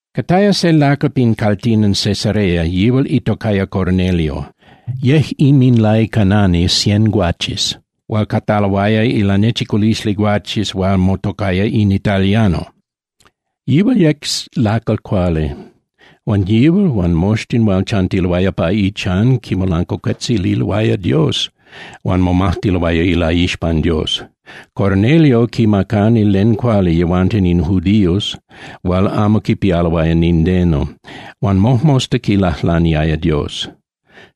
Cataya se lacal pin caltilan Cesarea, yihual itocaya Cornelio. Yec inminlaicanani cien guaches hual cataloaya ilanechiculisli guaches hual motocaya in Italiano. Yihual yec lacal cuali, huan yihual huan moxtin hual chantiloaya pa ichan quimolancuacuetzililoaya Dios huan momajtiloaya ilaixpan Dios. Cornelio quimacani len cuali yehuanten in judíos hual amo quipialoaya nindeno huan mojmosta quilajlaniaya Dios.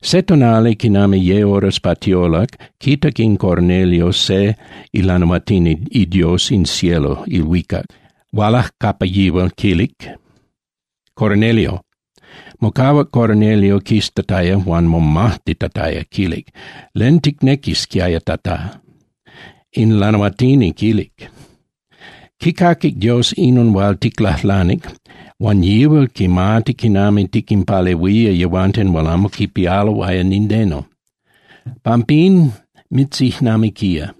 Se tonali quinami ye horas pa tiolac, quitac in Cornelio se ilanahuatini iDios in cielo (ilhuicac), hualac capa yihual quilic: —¡Cornelio! Mocahuac Cornelio quiztataya huan momajtitataya, quilic: —¿Len ticnequisquiaya, Tata? In lanahuatini quilic: —Quicaquic Dios inon hual ticlajlanic huan yihual quimati quinami tiquinpalehuía yehuanten hual amo quipialo nindeno. Pampín mitzijnamiquía.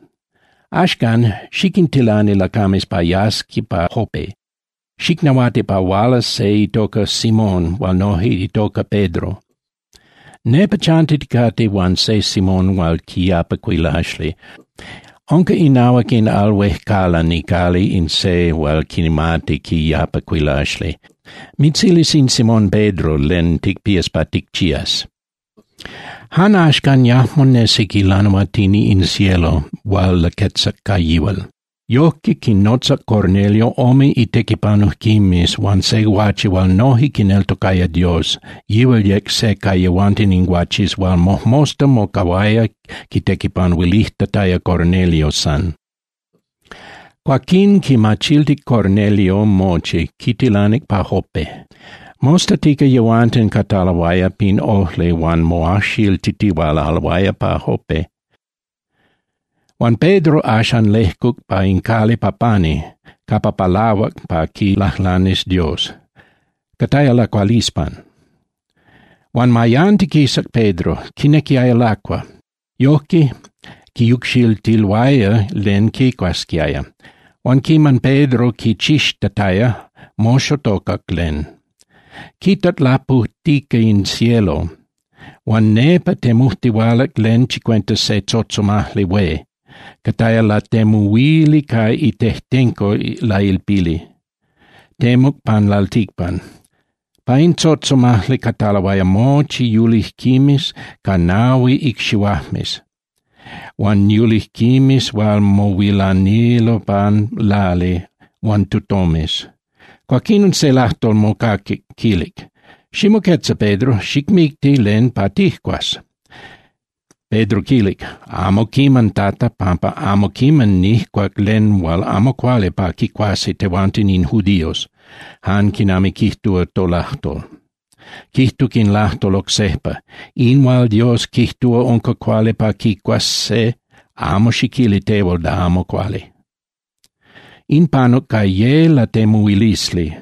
Axcan, xiquintilani lacames pa yasqui pa Jope, xicnahuati pa hualas se itoca Simón hual noje itoca Pedro. Nepa chantiticate huan se Simón hual quiyapa cuilaxli. Unca inahuac in al huejcalan icali in se hual quimati quiyapa cuilaxli. Mitzilis in Simón Pedro len ticpías pa ticchías. Jan axcan yajmo nesic ilanahuatini in cielo hual laquetzac ca yihual. Yojque quinnotzac Cornelio ome itequipanujquimes huan se guache hual noje quineltocaya Dios, yihual yec se ca yehuanten in guaches hual mojmosta mocahuaya quitequipanuilijtataya Cornelio san. Cuaquín quinmachiltic Cornelio mochi, quintilanic pa Jope. Mostatica, yehuanten cataloaya pin ojli huan moajxiltitihualaloaya pa Jope. Huan Pedro axan lejcuc pa in cali ca pani capa palahuac pa quilajlanis Dios, cataya lacualispan. Huan mayantiquisac Pedro, quinequiaya lacua. Yojque quiyucxiltiloaya len quicuasquiaya. Huan quiman Pedro quichixtataya, moxotocac len. Quitac lapujtica in cielo huan nepa temujtihualac len chicuenta se tzotzomajli hué, cataya latemuhuili ca itejtenco lailpili, temuc pan lalticpan. Pa in tzotzomajli cataloaya mochi yulijquimes ca nahui icxihuajmes huan yulijquimes hual mohuilanilo pan lali huan tutomes. Cuaquinon se lajtol mocaquic, quilic: —Ximoquetza, Pedro, xicmicti len pa tijcuas. Pedro quilic: —Amo quiman, Tata, pampa amo quiman nijcuac len hual amo cuali pa quicuasi tehuanten in judíos, jan quinami quijtúa tolajtol. Quijtuc in lajtol oc sejpa: —In hual Dios quijtúa unca cuali pa quicuas se, amo xiquili tehual da amo cuali. In panuc ca ye latemuhuilisli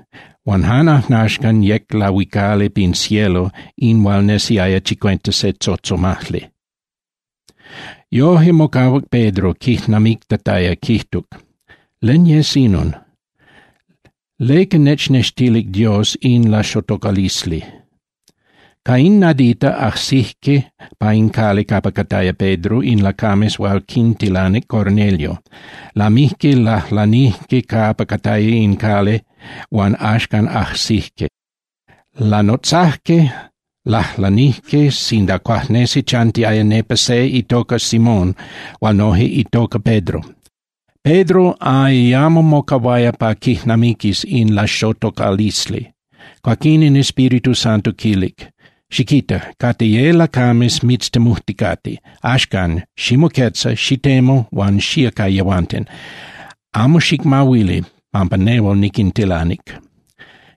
huan jan ajnaxcan yec lahuicali pin cielo in hual nesiaya chicuenta se tzotzomajli. Yoje mocahuac Pedro quijnamictataya, quijtuc: —¿Len yes inon? ¿Leca nechnextilic Dios in laxotocalisli? Ca in nadita, ajsijque pa in cali capa cataya Pedro in lacames hual quintilanic Cornelio, lamijque lajlanijque capa cataya in cali huan axcan ajsijque. Lanotzajque, lajlanijque sinda cuajnesi chantiaya nepa se itoca Simón hual noje itoca Pedro. Pedro ayamo mocahuaya pa quijnamiquis in laxotocalisli. Cuaquín in Espíritu Santo quilic: —Xiquita. Cate ye lacames mitztemujticate. Axcan, ximoquetza, xitemu huan xía ca yehuanten. Amo xicmahuili, pampa nehual niquintilanic.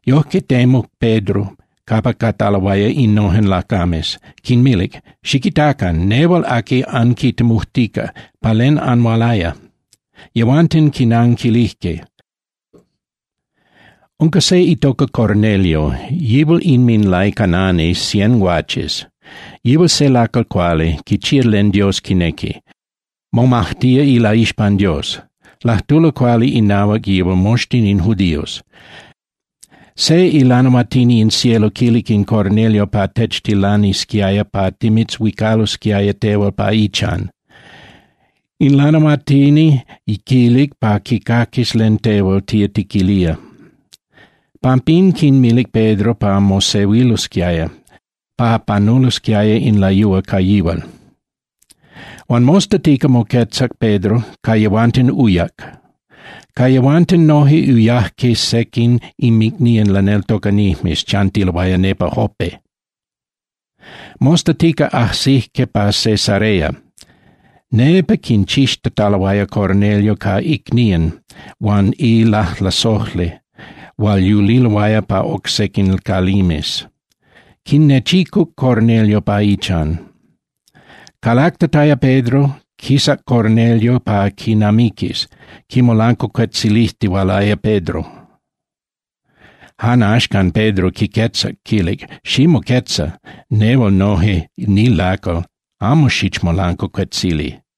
Yojque temuc Pedro capa cataloaya innojen lacames, quinmilic: —Xiquitacan. Nehual aqui anquitemujtica. ¿Pa len anhualaya? Yehuanten quinanquilijque: —Unca se itoca Cornelio, yihual inminlaicanani cien guaches. Yihual se lacal cuali, quichía len Dios quinequi, momajtía ilaixpan Dios. Lajtulo cuali inahuac yihual moxtin in judíos. Se ilanahuatini in cielo quilic in Cornelio pa techtilanisquiaya pa timitzhuicalosquiaya tehual pa ichan. In lanahuatini quilic pa quicaquis len tehual tía tiquilía. Pampín quinmilic Pedro pa mosehuilosquiaya, pa panulosquiaya in layúa ca yihual. Huan mostatica moquetzac Pedro, ca yehuanten uyac. Ca yehuanten noje uyajque sequin inmicnían laneltocanijmes, chantiloaya nepa Jope. Mostatica ajsijque pa Cesarea, nepa quinchixtataloaya Cornelio ca icnían huan ilajlasojli hual yuliloaya pa oc sequin calimes, quinnechicuc Cornelio pa ichan. Calactataya Pedro, quisac Cornelio pa quinamiquis, quimolancuacuetzilijtihualaya Pedro. Jan axcan, Pedro quiquetzac, quilic: —Ximoquetza, nehual noje nilacal, amo xichmolancuacuetzili.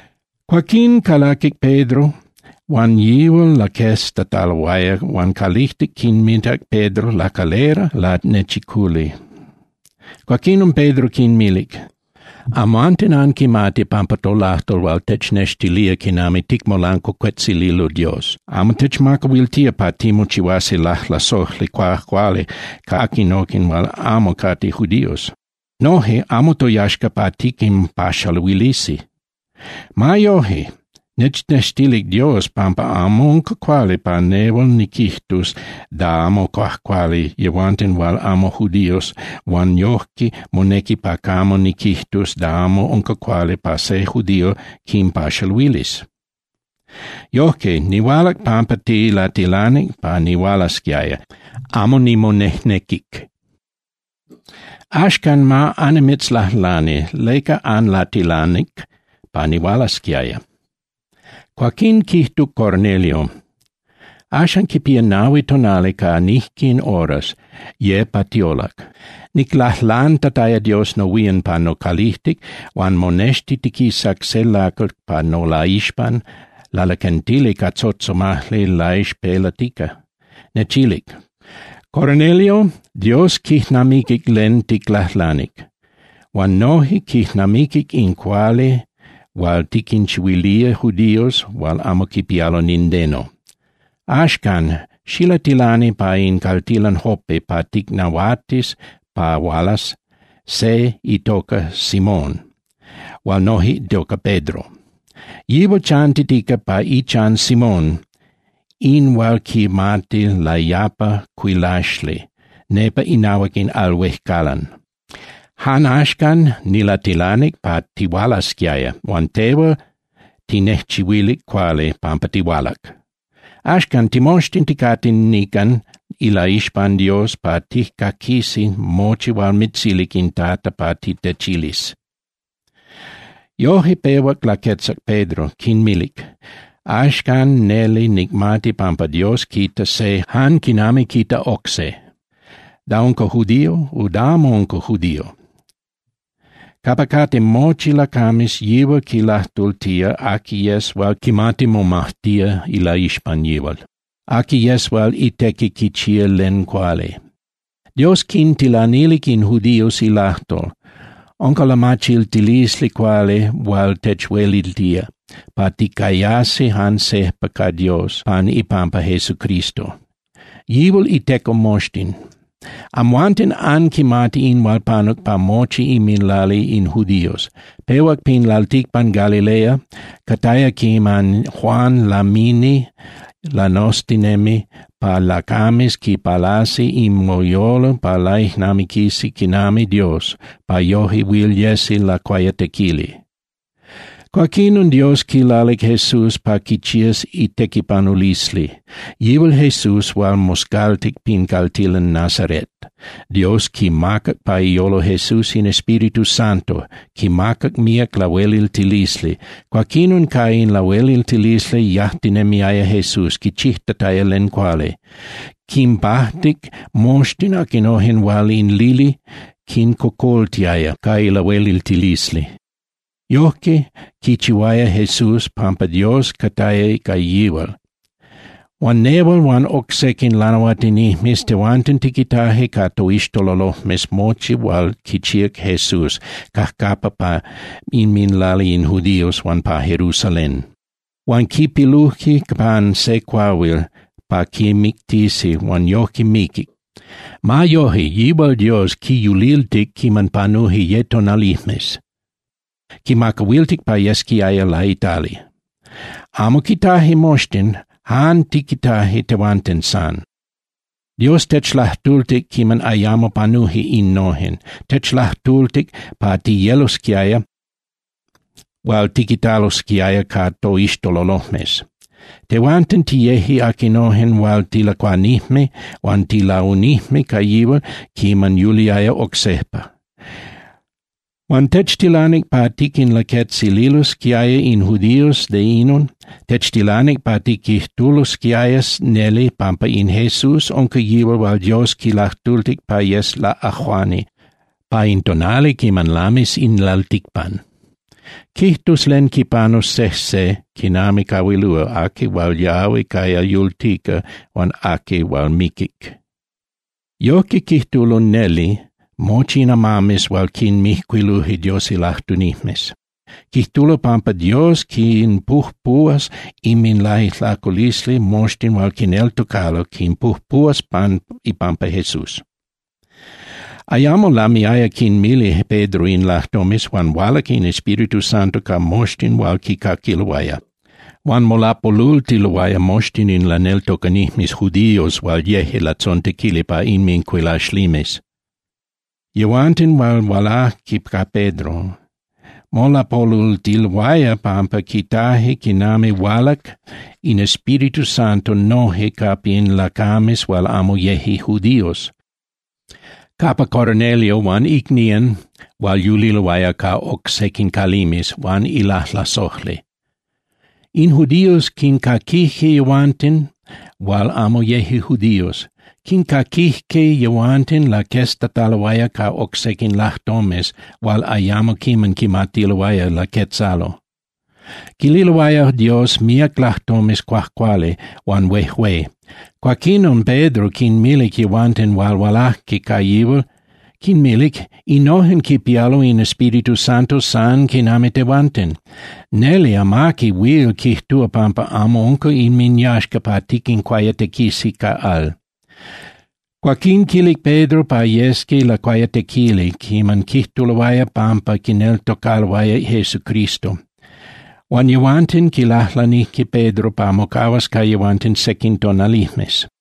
Cuaquín calaquic Pedro, huan yihual laqueztataloaya huan calijtic quinmitac Pedro lacalera lanechiculi. Cuaquinon Pedro quinmilic: —Amhuanten anquimati pampa tolajtol hual technextilía quinami ticmolancuacuetzililo Dios amo techmacahuiltía pa timochihuasi lajlasojli cuajcuali ca aquinojen hual amo cate judíos. Noje amo toyaxca pa tiquinpaxaluilisi. Ma yoje, nechnextilic Dios pampa amo unca cuali pa nehual niquijtus da amo cuajcuali yehuanten hual amo judíos huan yojque monequi pa camo niquijtus da amo unca cuali pa se judío quinpaxaluilis. Yojque, nihualac pampa tilatilanic pa nihualasquiaya, amo nimonejnequic. Axcan, ma annimitzlajlani, ¿leca anlatilanic pa nihualasquiaya? Cuaquín quijtuc Cornelio: —Axan quipía nahui tonali ca nijquin horas, ye pa tiolac, niclajlantataya Dios nohuían pa nocalijtic huan monextitiquisac se lacal pa nolaixpan lalaquentili ca tzotzomajli laixpelatica. Nechilic: “Cornelio, Dios quijnamiquic len ticlajlanic, huan noje quijnamiquic in cuali hual tiquinchihuilía judíos hual amo quipialo nindeno. Axcan, xilatilani pa in caltilan Jope pa ticnahuatis pa hualas se itoca Simón hual noje itoca Pedro. Yihual chantitica pa ichan Simón in hual quimati layapa cuilaxli nepa inahuac in al huejcalan.” Jan axcan, nilatilanic pa tihualasquiaya huan tehual tinejchihuilic cuali pampa tihualac. Axcan, timoxtin ticate nican ilaixpan Dios pa tijcaquisi mochi hual mitzilic in Tata pa titechilis. Yoje pehuac laquetzac Pedro, quinmilic: —Axcan neli nicmati pampa Dios quita se jan quinami quita oc se, da unca judío o da amo unca judío. Capa cate mochi lacames yihual quilajtultía aqui yes hual quimati momajtía ilaixpan yihual, aqui yes hual itequi quichía len cuali. Dios quintilanilic in judíos ilajtol, unca lamachiltilisli cuali hual techhueliltía pa ticayasi jan sejpa ca Dios pan ipampa Jesucristo. Yihual iteco moxtin. Amhuanten anquimati in hual panuc pa mochi inminlali in judíos. Pehuac pin lalticpan Galilea, cataya quiman Juan lamini lanoztinemi pa lacames quipalasi inminyolo pa laijnamiquisi quinami Dios, pa yoje huil yesi lacuayatequili. Cuaquinon Dios quilalic Jesús pa quichías itequipanulisli, yihual Jesús hual moscaltic pin caltilan Nazaret. Dios quimacac pa iyolo Jesús in Espíritu Santo, quimacac míac lahueliltilisli. Cuaquinon ca in lahueliltilisli yajtinemiaya Jesús quichijtataya len cuali. Quinpajtic moxtin aquinojen hual in lili quincocoltiaya ca ilahueliltilisli. Yojque quichihuaya Jesús pampa Dios cataya ca yihual. Huan nehual huan oc sequin lanahuatinijmes, tehuanten tiquitaje ca toixtololojmes mochi hual quichíac Jesús cajcapa pa inminlali in judíos huan pa Jerusalén. Huan quipiluje pan se cuahuil pa quimictisi huan yojque miquic. Ma yoje, yihual Dios quiyuliltic quiman panuje ye tonalijmes, quimacahuiltic pa yesquiaya laitali. Amo quitaje moxtin, jan tiquitaje tehuanten san. Dios techlajtultic quiman ayamo panuje innojen, techlajtultic pa tiyelosquiaya hual tiquitalosquiaya ca toixtololojmes. Tehuanten tiyeje aquinojen hual tilacuanijme huan tilaunijme ca yihual quiman yuliaya oc sejpa. Huan techtilanic pa tiquinlaquetzililosquiaya in judíos de inon. Techtilanic pa tiquijtulosquiaya neli pampa in Jesús unca yihual hual Dios quilajtultic pa yes laꞌajuani pa in tonali quiman lamis in lalticpan. Quijtus len quipanus sejse quinami cahuilúa aqui hual yahui caya yultica huan aqui hual miquic. Yojque quijtulo neli mochi in amames hual quinmijcuiluje Dios ilajtunijmes. Quijtulo pampa Dios quinpujpuhuas inminlaijlaculisli moxtin hual quineltocalo, quinpujpuhuas pan ipampa Jesús. Ayamo lamiaya quinmili Pedro in lajtomes huan hualac in Espíritu Santo ca moxtin hual quicaquiloaya. Huan molapolultiloaya moxtin in laneltocanijmes judíos hual yeje latzontequili pa inmincuilaxlimes, yehuanten hual hualajque ca Pedro. Molapolultiloaya pampa quitajque quinami hualac in Espíritu Santo noje capa in lacames hual amo yeje judíos, capa Cornelio huan icnían hual yuliloaya ca oc sequin calimes huan ilajlasojli. In judíos quincaquijque yehuanten hual amo yeje judíos. Quincaquijque yehuanten laqueztataloaya ca oc sequin lajtomes hual ayamo quiman quimatiloaya laquetzalo. Quililoaya Dios míac lajtomes cuajcuali huan huejué. Cuaquinon Pedro quinmilic yehuanten hual hualajque ca yihual, quinmilic: —Innojen quipialo in Espíritu Santo san quinami tehuanten. Neli amaqui huil quijtúa pampa amo unca inminyaxca pa tiquincuayatequisi ca al. Cuaquín quilic Pedro pa yesqui lacuayatequili quiman quijtuloaya pampa quineltocaloaya Jesucristo. Huan yehuanten quilajlanijque Pedro pa mocahuas ca yehuanten sequin tonalijmes.